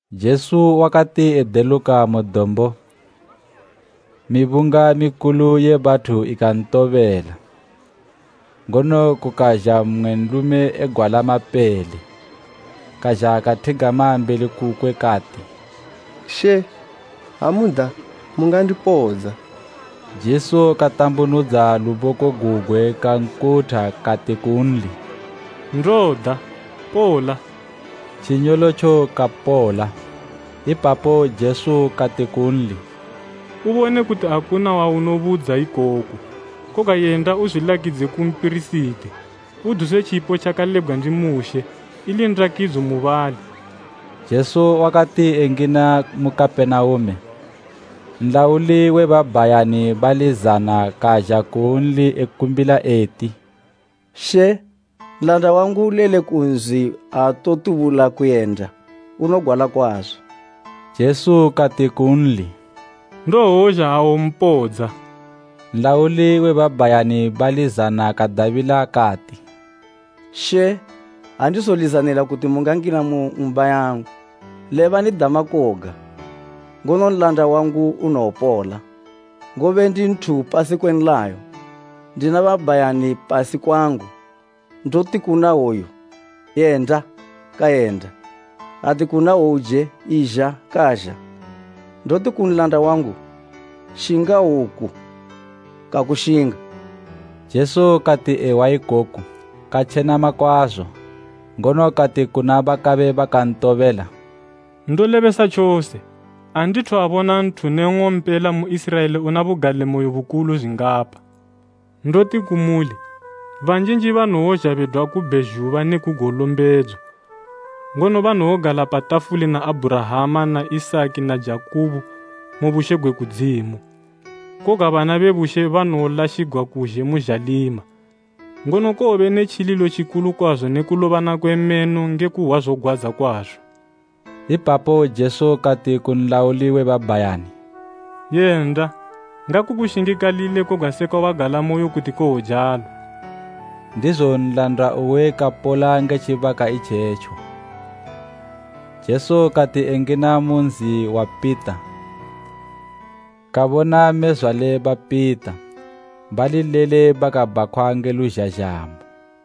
Jesu wakati edeluka mu dombo, mibunga mikulu ye bathu ikantobela. Ngono kukazha mmwe nlume egwala mapele, kazha kathigama mbeli kukwe kati, “She, ha muda, mungandipodza.” Jesu katambunudza luboko gugwe kankutha kati kunli, “Ndoda. Pola!” Tjinyolotjo kapola. Ipapo Jesu kati kunli, “Ubone kuti akuna waunobudza ikoku. Koga yenda uzwilakidze ku mpirisiti, uduse tjipo tjakalebgwa ndi Mushe, ili ndakidzo mubali.” Jesu wakati engina mu Kapenaume, nlauli we babhayani bali zana kazha kunli ekumbila eti, “She, nlanda wangu ulele ku nzi aatokuyenda, unogwala kwazo.” Jesu kati kunli, “Ndowozha awompodza.” Nlauli we babhayani bali zana kadabila kati, “She andizolizanila kuti mungangina mu ng'umba yangu. Lebani dama koga, ngono nlanda wangu unowopola. Ngobe ndi nthu upasi kwe nlayo, ndina babhayani pasi kwangu. Ndoti kuna hwoyu, ‘Yenda!’ kayenda, ati kuna hwouje, ‘Izha!’ kazha. Ndoti ku nlanda wangu, ‘Shinga woku!’ kakushinga.” Jesu kati ehwa ikoku katjenama kwazo, ngono kati kuna bakabe bakantobela, “Ndolebesa tjose, andithu abona nthu ne nng'ompela mu Iziraela una bugalimoyo bukulu zwingapa. Ndoti kumuli, banjinji banowozha bedwa ku bhezhuba neku golombedzo, ngono banowogala pa tafuli na Abhurahama na Isaki na Jakubo mu bushe gwe kudzimu. Koga bana be bushe banowolashigwa kuzhe mu zhalima, ngono kowobe ne tjililo tjikulu kwazo ne kulobana kwe meno nge kuhwa zogwadza kwazo.” Ipapo Jesu kati ku nlauli we babhayani, “Yenda! Ngakukushingikalile koga sekwa wagalamoyo kuti kowojalo.” Ndizo nlanda uwe wakapola nge tjibaka itjetjo. Jesu kati engina mu nzi wa Pita, kabona mmezwale ba Pita bali lele bakabhakhwa nge luzhazhamo.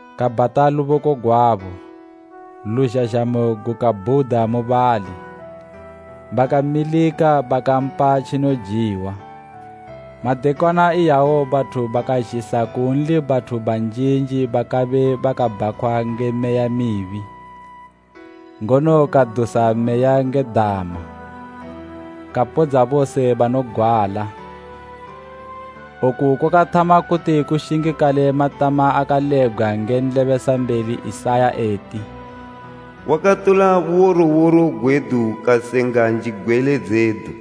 Kabhata luboko gwabo, luzhazhamo gukabhuda mubali, bakamilika bakampa tjinojiwa. Madekwana iyawo bathu bakazhisa kunli bathu banjinji bakabe bakabhakhwa nge meya mibi, ngono kadusa meya nge dama, kapodza bose banogwala. Oku kwakathama kuti kushingikale matama akalebgwa nge nlebesambeli Isaya eti, “Wakatola buworoworo gwedu kasenga njigwele dzedu.”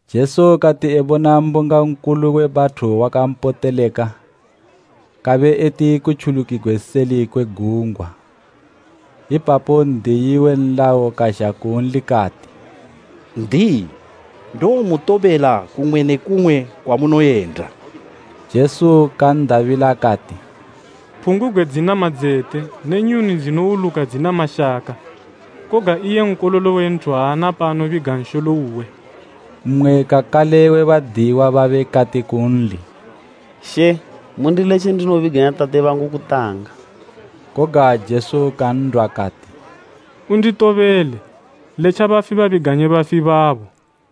Jesu kati ebona mbunga nkulu we bathu wakampoteleka, kabe eti kutjulukigwe seli kwe gungwa. Ipapo N'diyi we nlayo kazha kunli kati, “N'diyi, ndowomutobela kumwe ne kumwe kwamunoyenda.” Jesu kan'dabila kati, “Phungubgwe dzina madzete ne nyuni dzinowuluka dzina mashaka, koga iye Nkololo we Nthu aana paanobiga nsholo uwe.” Mmwe kakale we badiyiwa babe kati kunli, “She mundiletje ndinobiganya tate bangu kutanga.” Koga Jesu kan'dwa kati, “Unditobele, letja bafi babiganye bafi babo.”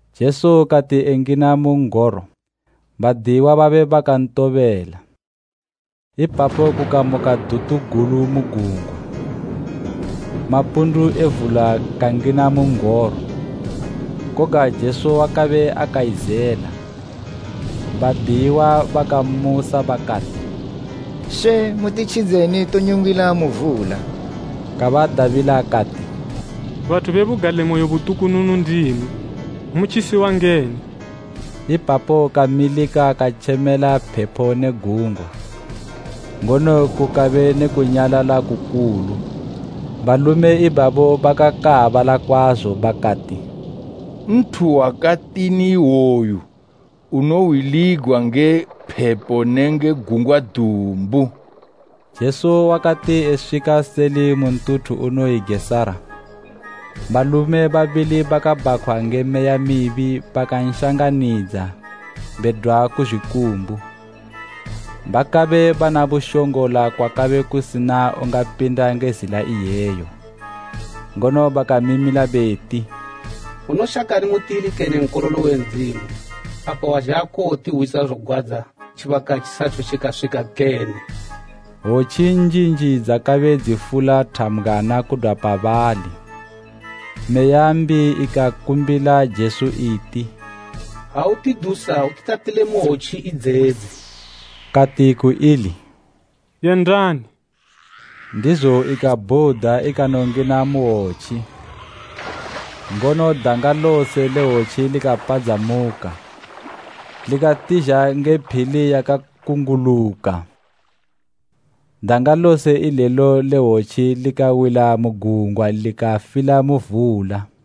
Jesu kati engina mu n'goro, badiyiwa babe bakantobela. Ipapo kukamuka dutu gulu mu gungwa, mapundu e vula kangina mu n'goro. Koga Jesu wakabe akaizela. Badiyiwa bakammusa bakati, “She, mutitjidze tonyungila mu vula!” Kabadabila kati, “Bathu be bugalimoyo butukununu ndimwi! Motjisiwa ngeni?” Ipapo kamilika katjemela phepo ne gungwa, ngono kukabe ne kunyalala kukulu. Balume ibabo bakakaabala kwazo, bakati, “Nthu wakatini iwoyu unohwiligwa nge phepo nenge gungwa dumbu?” Jesu wakati eswika seli mu ntuthu unoyi Gerasa, balume babili bakabhakhwa nge meya mibi bakanshanganidza bedwa ku zwikumbu. Bakabe bana bushongola kwakabe kusina ungapinda nge zila iyeyo. Ngono bakamimila beti, “Unoshakani mutili kene Nkololo we Ndzimu? Apa wazha kuwotihwisa zogwadza tjibaka tjisathu tjikaswika kene?” Hwotji njinji dzakabe dzifula thambgwana kudwa pabali. Meya mbi ikakumbila Jesu iti, “Ha utidusa, utitatile mu hwotji idzedzi.” Kati ku ili, “Yendani!” Ndizo ikabhuda ikanongina mu hwotji, ngono, danga lose le hwotji likapadzamuka likatizha nge phili yakakunguluka. Danga lose ilelo le hwotji likawila mu gungwa likafila mu vula.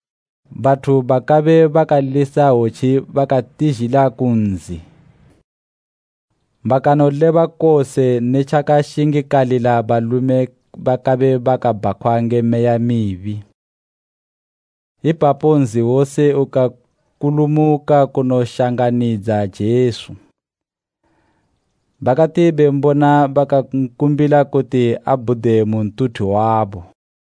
Bathu bakabe bakalisa hwotji bakatizhila ku nzi, bakanoleba kose ne tjaka shingikalila balume bakabe bakabhakhwa nge meya mibi. Ipapo nzi wose ukakulumuka kunoshanganidza Jesu. Bakati bembona bakankumbila kuti abhude mu ntuthu wabo.